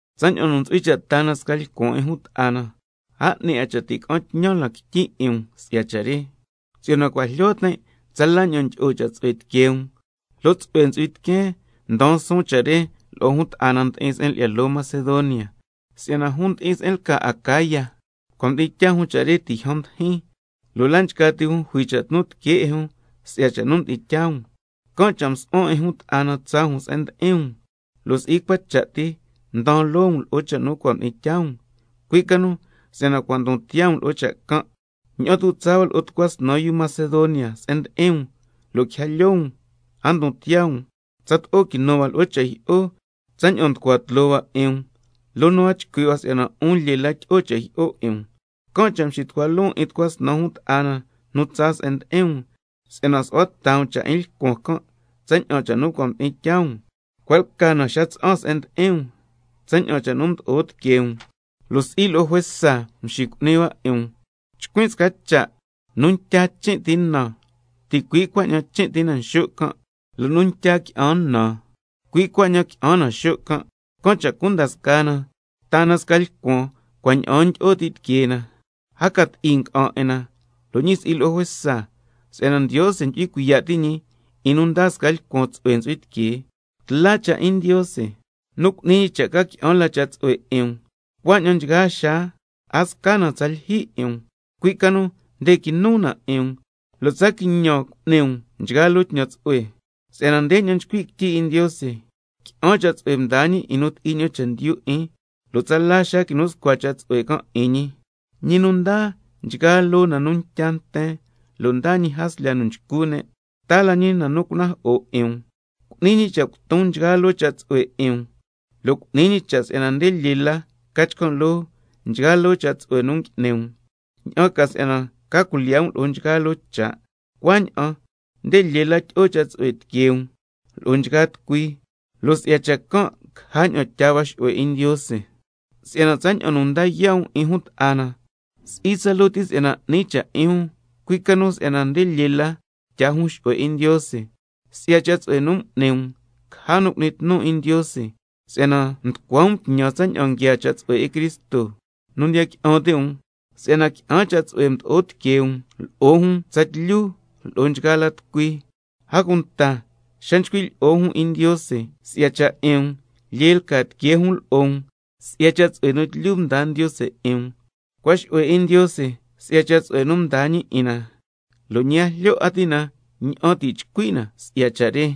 Tsaña'an nu ntsu'hui cha' taa na sca lcuan 'in jun ta'a na, a 'ni cha' ti' ca'an tñan lan quityi 'in um si'ya cha' re, si'yana cua' jlyo tin' tsala ña'an ndyi'o cha' tsu'hue tiquee um, lo' tsu'hue ntsu'hui tiqueen ndaan suun cha' re lo'o jun ta'a na ndi'in se'en lyi'ya loo Macedonia, si'yana jun ndi'in se'en lca Acaya cua' mdi'in tyaa jun cha' re ti' yjan mdijin, lo' la' nchgaa ti jun jui cha' tnu tiquee 'in jun si'ya cha' nu mdi'in tyaa um. Can' cha' msu'huan 'in jun ta'a na tsaa jun se'en ndi'in um, lo' si'i cua cha' ti mdaan loo um lo'o cha' nu cua' mdi'in tyaa um, cui' ca nu si'yana cua' ndon tiyaa um lo'o cha' can', ña'an tu' tsaa hua lo'o tucua snan yu Macedonia se'en ndi'in um, lo' quija lyoo um a ndon tiyaa um, tsato'o quinu hua lo'o cha' jyi'o tsaña'an nducua tloo hua 'in um, loo nu a chcui' hua si'yana 'un lyee la tyi'o cha' jyi'o 'in um. Can' cha' mxitucua loon 'in tucua snan jun ta'a na nu tsaa se'en ndi'in um, si'yana su'hua ta um cha' 'in lcuan can' tsaña'an cha' nu cua' mdi'in tyaa um, cua' lca na xa tsa'an se'en ndi'in um, tsaña'an cha' nu mdo'o tiquee um lo' si'i lo'o juesa mxicu'ni hua 'in um. Chcuin' sca cha': Nu ntya chin' ti na, ticui' cuaña'an chin' ti na xo' can', lo' nu ntya qui'an na, cui' cuaña'an qui'an na xo' can'. Can' cha' cunda scaa na taa na sca lcuan cua' ña'aan ndyi'o ti tiquee na, a ca ti'i nga'an 'in na, lo' ñi si'i lo'o juesa, si'yana —Ndiose ndyu'hui cuiya' ti' ñi 'in nu ndaa sca lcuan tsu'hue ntsu'hui tiquee—. Tla cha' 'in Ndiose nu cu'ni ñi cha' ca qui'an la cha' tsu'hue 'in um, cuaña'an nchgaa xaa a sca na tsa lyijyi 'in um, cui' ca nu nde quinu na 'in um lo' tsa quiñan cu'ni um nchgaa loo tñan tsu'hue. Si'yana ndeña'an nchcui' quityi 'in Ndiose: —Qui'an cha' tsu'hue mdaa ñi 'in nu ti'i ña'an chendyu 'in, lo' tsala xaa quinu scua cha' tsu'hue can' 'in ñi—. Ñi nu ndaa nchgaa loo na nu ntya nten, lo' ndaa ñi jaslya nu nchcu ne', taa la ñi na nu cunajo'o 'in um, cu'ni ñi cha' cuton nchgaa loo cha' tsu'hue 'in um, lo' cu'ni ñi cha' si'yana nde lyee la ca chcan' loo nchgaa loo cha' tsu'hue nu ngui'ni um, ña'an ca si'yana ca cuilyiya' um lo'o nchgaa loo cha', cuaña'an nde lyee la tyi'o cha' tsu'hue tiquee um lo'o nchgaa tucui, lo' si'ya cha' can' caja ña'an tyaa hua xu'hue 'in Ndiose. Si'yana tsaña'an nu nda yaa' um 'in jun ta'a na, si'i tsaloo ti si'yana 'ni cha' 'in jun, cui' ca nu si'yana nde lyee la tyaa jun xu'hue 'in Ndiose. Si'ya cha' tsu'hue nu m'ni um, caja nu cu'ni tnu 'in Ndiose si'yana nducua um tñan tsaña'an nguiaa cha' tsu'hue 'in Cristo nu ndiya qui'an ti' um, si'yana qui'an cha' tsu'hue mdo'o tiquee um lo'o jun tsatlyu lo'o nchgaa la tucui. A cunta xa nchcui' lyi'o jun 'in Ndiose si'ya cha' 'in um, lyee lca tiquee jun lo'o um si'ya cha' tsu'hue nu tlyu mdaa Ndiose 'in um. Cua' xu'hue 'in Ndiose si'ya cha' tsu'hue nu mdaa ñi 'in na, lo' ñi a jlyo ti' na ña'an ti' chcui' na si'ya cha' re.